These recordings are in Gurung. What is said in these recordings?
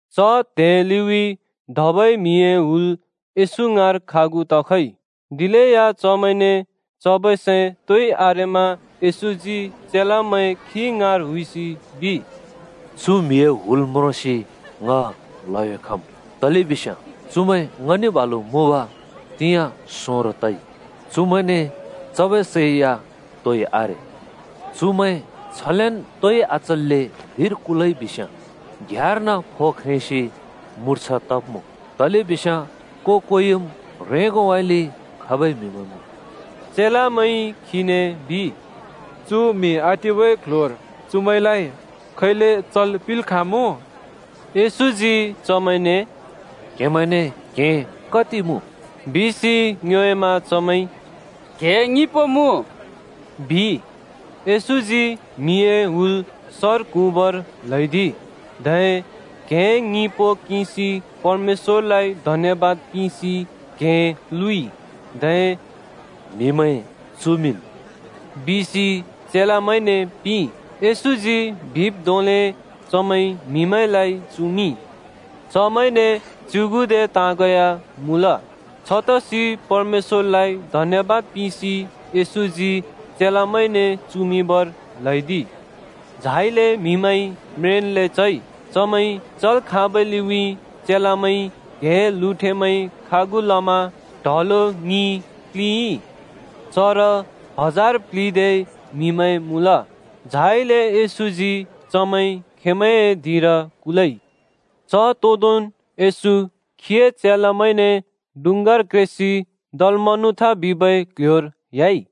च त्हे लिउँइँ धबै म्‍हिए हुल येशू ङाँर खागु तखइ। दिलेया चमैंने चबै सै तोइ आरेमा येशूजी चेलामैं खी ङाँर हुइसि बिइ, “चु म्हिए हुल म्रोंसि ङ ल्‍हयो खम्, तलेबिस्याँ चुमैं ङने बालु मुँब तिंयाँ सोंरो तइ। चुमैंने चबै सै तोइ आरे। चुमैं छलेन् तोइ आचल्‍ले धिंर कुलइ बिस्‍याँ घ्‍याँर्न फो ख्रेंसि मुर्छा तब्मुँ। तलेबिस्याँ को-कोइम् ह्रेंगोउँइँले खबै म्‍हिमैं मुँ।” चेलामैंइ खीने बिइ, “चु म्‍हि आटिबै क्‍ल्‍ह्‍योर चुमैंलाइ खैले चल् पिंल् खाँमुँ?” येशूजी चमैंने “क्‍हेमैंने क्‍हें कति पो मुँ?” बिसि ङ्योएमा चमैंइ “क्हें ङिपो मुँ,” बिइ। येशूजी म्हिए हुल सर क्हुँबर ल्हैदिइ। धै क्‍हें ङिपो किंसि परमेश्‍वरलाइ धन्‍यबाद पिंसि क्‍हें लुँइ। धै “म्‍हिमैं चुमिंन्” बिसि चेलामैंने पिंइ। येशूजी बिब् धोंले चमैंइ म्‍हिमैंलाइ चुमिंइ। चमैंने च्‍युगुदे ताँग या मुँल। छतसि परमेश्‍वरलाइ धन्‍यबाद पिंसि येशूजी चेलामैंने चुमिंबर ल्हैदिइ। झाइले म्हिमैंइ म्रेंन्‍ले चइ। चमैंइ चल् खाँबै लिउँइँ चेलामैंइ क्हें लुँठेमैं खागु लमा ड्हलो ङि प्‍लिंइ। चर हजार प्‍लिदे म्‍हिमैं मुँल। झाइले येशूजी चमैं खेंमैंए धिंर कुलइ। च तोदोंन् येशू खीए चेलामैंने डुँङ्गार क्रेसि दलमनुथा बिबै क्ल्ह्‍योर ह्‍याइ।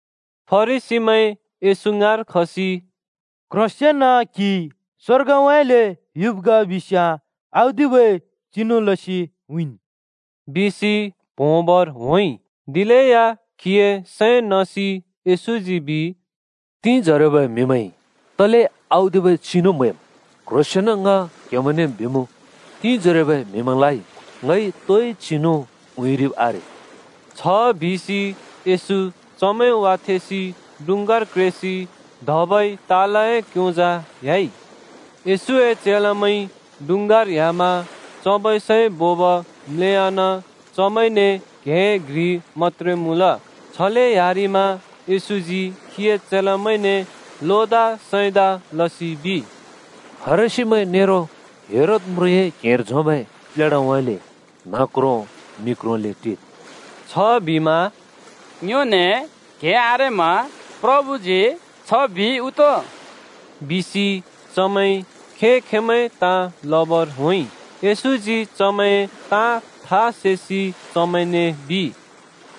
फरिसीमैं येशू ङाँर खसि “क्ह्रोंसंन क्हि स्वर्गउँइँले युब् ग बिस्याँ औदिबै चिनु लसि उँइँन्,” बिसि प्होंबर होंइ। दिलेया खीए सैं नसि येशूजी बिइ, “तिंजोरोबै म्‍हिमैंइ तले औदिबै चिनु म्‍हैम्? क्‍ह्रोंसेंन् ङ क्‍हेमैंने बिमुँ, तिंजोरोबै म्हिमैंलाइ ङइ तोइ चिनु उँइँरिब् आरे।” छ बिसि येशू चमैं वाथेंसि डुँङ्गार क्रेसि धबै तालए क्‍योंजा ह्‍याइ। येशूए चेलामैंइ डुँङ्गार ह्‍यामा चबै सै बोब म्‍लेयान चमैंने क्हें घ्रि मत्‍त्रे मुँल। छले ह्‍यारिमा येशूजी खीए चेलामैंने लोदा सैंदा लसि बिइ, “फरिसीमैं नेरो हेरोद म्रुँए क्हेंर झोंबै प्लेढाउँइँले न्ह क्रों मि क्रोंले टिद्।” छबिमा “ङ्योने क्हें आरेमा प्रभुजी छ बिइ उ तो?” बिसि चमैंइ खें-खेंमैं ताँ लबर होंइ। येशूजी चमैंए ताँ था सेसि चमैंने बिइ,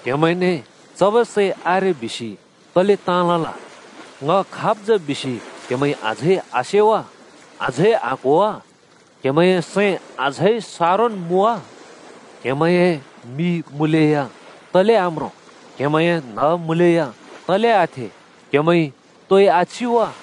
“क्‍हेमैंने चबै सै आरे बिसि तले ताँ लल? ङ खाब् जा बिसि क्‍हेमैंइ अझै आसे वा? अझै आक्‍हो वा? क्‍हेमैंए सैं अझै सारोन् मुँ वा? क्‍हेमैंए मि मुँलेया तले आम्रों? क्‍हेमैंए न्‍ह मुँलेया तले आथे? क्‍हेमैंइ तोइ आचि वा?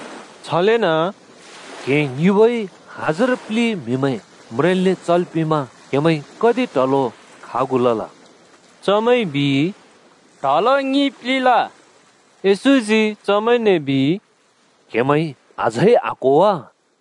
छलेन “क्‍हें ङिपोइ हजार प्‍लि म्‍हिमैं म्रेंन्ले चल् पिमा क्हेमैंइ कति ट्हलो खागु लल?” चमैंइ बिइ, “ट्हलो ङि प्लिंल।” येशूजी चमैंने बिइ, “क्‍हेमैंइ अझै आक्‍हो वा?”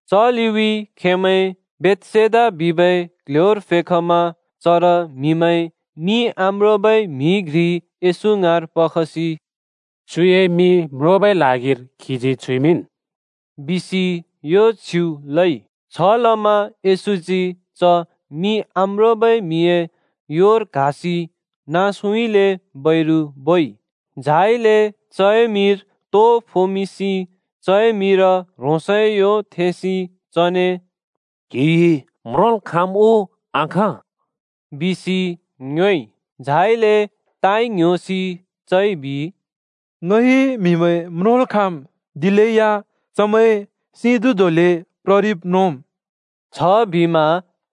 च लिउँइँ खेंमैं बेथसेदा बिबै क्‍ल्‍ह्‍योर फेखमा चर म्‍हिमैंइ मि आम्रोंबै म्हि घ्रि येशू ङाँर पखसि “चुए मि म्रोंबै ल्हागिर क्हिजी छुइमिंन्,” बिसि यो छ्युँ लइ। छलमा येशूजी च मि आम्रोंबै म्‍हिए योर क्‍हासि नाँसउँइँले बैरु बोइ। झाइले चए मिर तु फोमिंसि चए मिर ह्रोंसए यो थेंसि “क्‍हिइ म्रोंल् खाँम् उ आखाँ?” बिसि चने ङ्योएइ। झाइले ताइ ङ्‌ह्‍योसि चइ बिइ, “ङइ म्‍हिमैं म्रोंल् खाँम्, दिलेया चमैं सिं धुँ धोंले प्ररिब् म्रोंम्।” छबिमा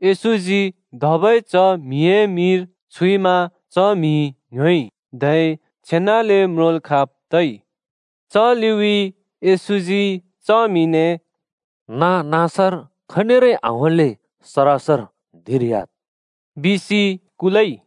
येशूजी धबै च म्‍हिए मिर छुइमा च म्‍हिइ ङ्‌ह्‍योइ,धै छेनाले म्रोंल् खाँब् तइ। च लिउँइँ येशूजी च म्‍हिने “नाँ-नाँसर खनिरै आहोंल्‍ले सरासर धिंर ह्‍याद्,” बिसि कुलइ।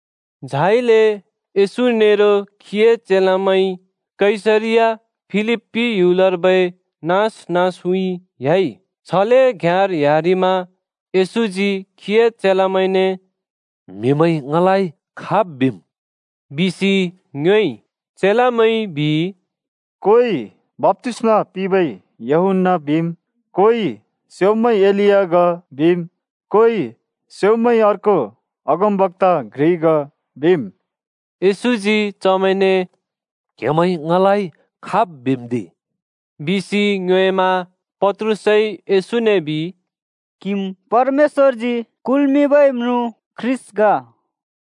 झाइले येशू नेरो खीए चेलामैं कैसरिया फिलिप्‍पी ह्‍युलर्बै नाँस नाँसउँइँ ह्‍याइ। छले घ्‍याँर ह्‍यारिमा येशूजी खीए चेलामैंने “म्‍हिमैंइ ङलाइ खाब् बिम्?” बिसि ङ्योएइ। चेलामैंइ बिइ, “कोइ ‘बप्‍तिस्‍मा पिंबै यूहन्‍ना’ बिम्, कोइ ‘स्‍योंम्‍बै एलिया ग,’ बिम्, कोइ ‘स्‍योंम्‍बै अर्को अगमबक्‍ता घ्रि ग’ बिम्।” येशूजी चमैंने “क्‍हेमैंइ ङलाइ खाब् बिम्दि?” बिसि ङ्योएमा। पत्रुसइ येशूने बिइ, “क्‍हिम् परमेश्‍वरजी कुल्मिंबै म्रुँ ख्रीष्‍ट ग।”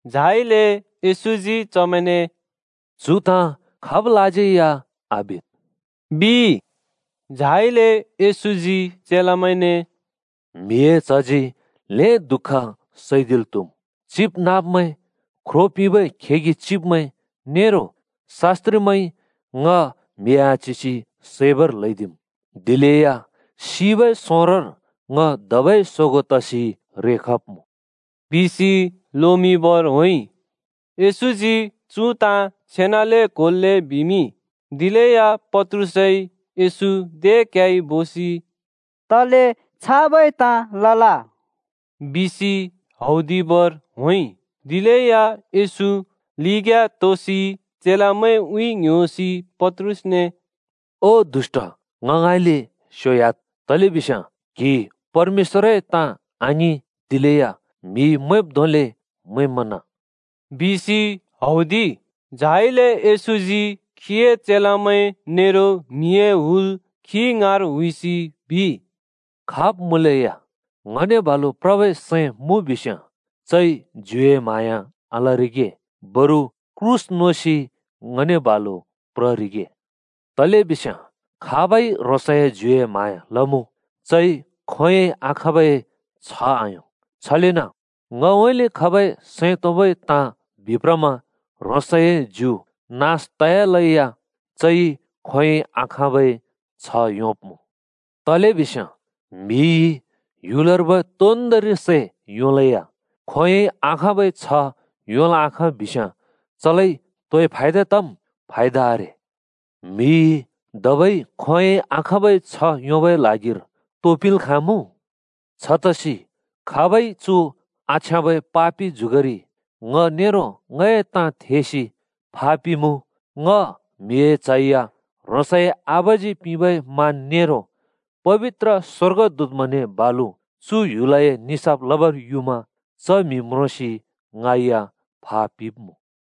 झाइले येशूजी चमैंने “चु ताँ खाबलाज्यै या आबिद्,” बिइ। झाइले येशूजी चेलामैंने “म्हिए च्हजी ल्‍हें दुःख सैदिल् त्‍हुम्। चिबनाँब्मैं, ख्रो पिंबै खेगि चिब्मैं नेरो शास्‍त्रिमैंइ ङ म्‍हि आच्‍हिसि सैबर ल्हैदिम्। दिलेया सिबै सोंरोर ङ धबै सोगों तसि रेखब्मुँ बिसि लोमिंबर होंइ।” येशूजी चु ताँ छेनाले क्होल्‍‍ले बिमिंइ। दिलेया पत्रुसइ येशू दे क्‍याइ बोसि “तले छाबै ताँ लल?” बिसि हौदिबर होंइ। दिलेया येशू लिग्‍याँ तुसि चेलामैंउँइँ ङ्‌ह्‍योसि पत्रुसने “ओ दुष्‍ट, ङ ङाँइँले स्‍योह्‍याद्! तलेबिस्याँ क्‍हि परमेश्‍वरए ताँ आङिं, दिलेया म्‍हिइ मैंब् धोंले मैंमना,” बिसि हौदिइ। झाइले येशूजी खीए चेलामैं नेरो म्हिए हुल खी ङाँर हुइसि बिइ, “खाब् मुँलेया ङने बालु प्रबै सैं मुँ बिस्‍याँ चइ ज्युए म्हाँया आलरिगे बरु क्रूस नोसि ङने बालु प्ररिगे। तलेबिस्याँ खाबइ ह्रोंसए ज्युए म्हाँया लमुँ, चइ खोंयोंइ आखाँबै छ्ह आयों, छलेन ङउँइँले खबै सैं तोंबै ताँ बिप्रमा ह्रोंसए ज्यु नास तयालेया चइ खोंयोंइ आखाँबै छ्ह योंब्मुँ। तलेबिस्याँ म्हिइ ह्‍युलर्बै तोन्दोंरि सैं योंलेया खोंयोंइ आखाँबै छह् योंल् आखाँ बिस्‍याँ चलाइ तोए फायदा तम्? फायदा आरे! म्हिइ धबै खोंयोंइ आखाँबै छह् योंबै ल्हागिर तो पिंल् खाँमुँ? छतसि खाबइ चु आछ्याँबै पापि जुगरि ङ नेरो ङए ताँ थेसि फापिमुँ, ङ म्हिए च्ह या ह्रोंसए आबाजी पिंबै मान नेरो पबित्र स्‍वर्गदूतमैंने बालु चु ह्‍युलए निसाफ लबर युमा च म्‍हि म्रोंसि ङै या फा पिब्‍मुँ।”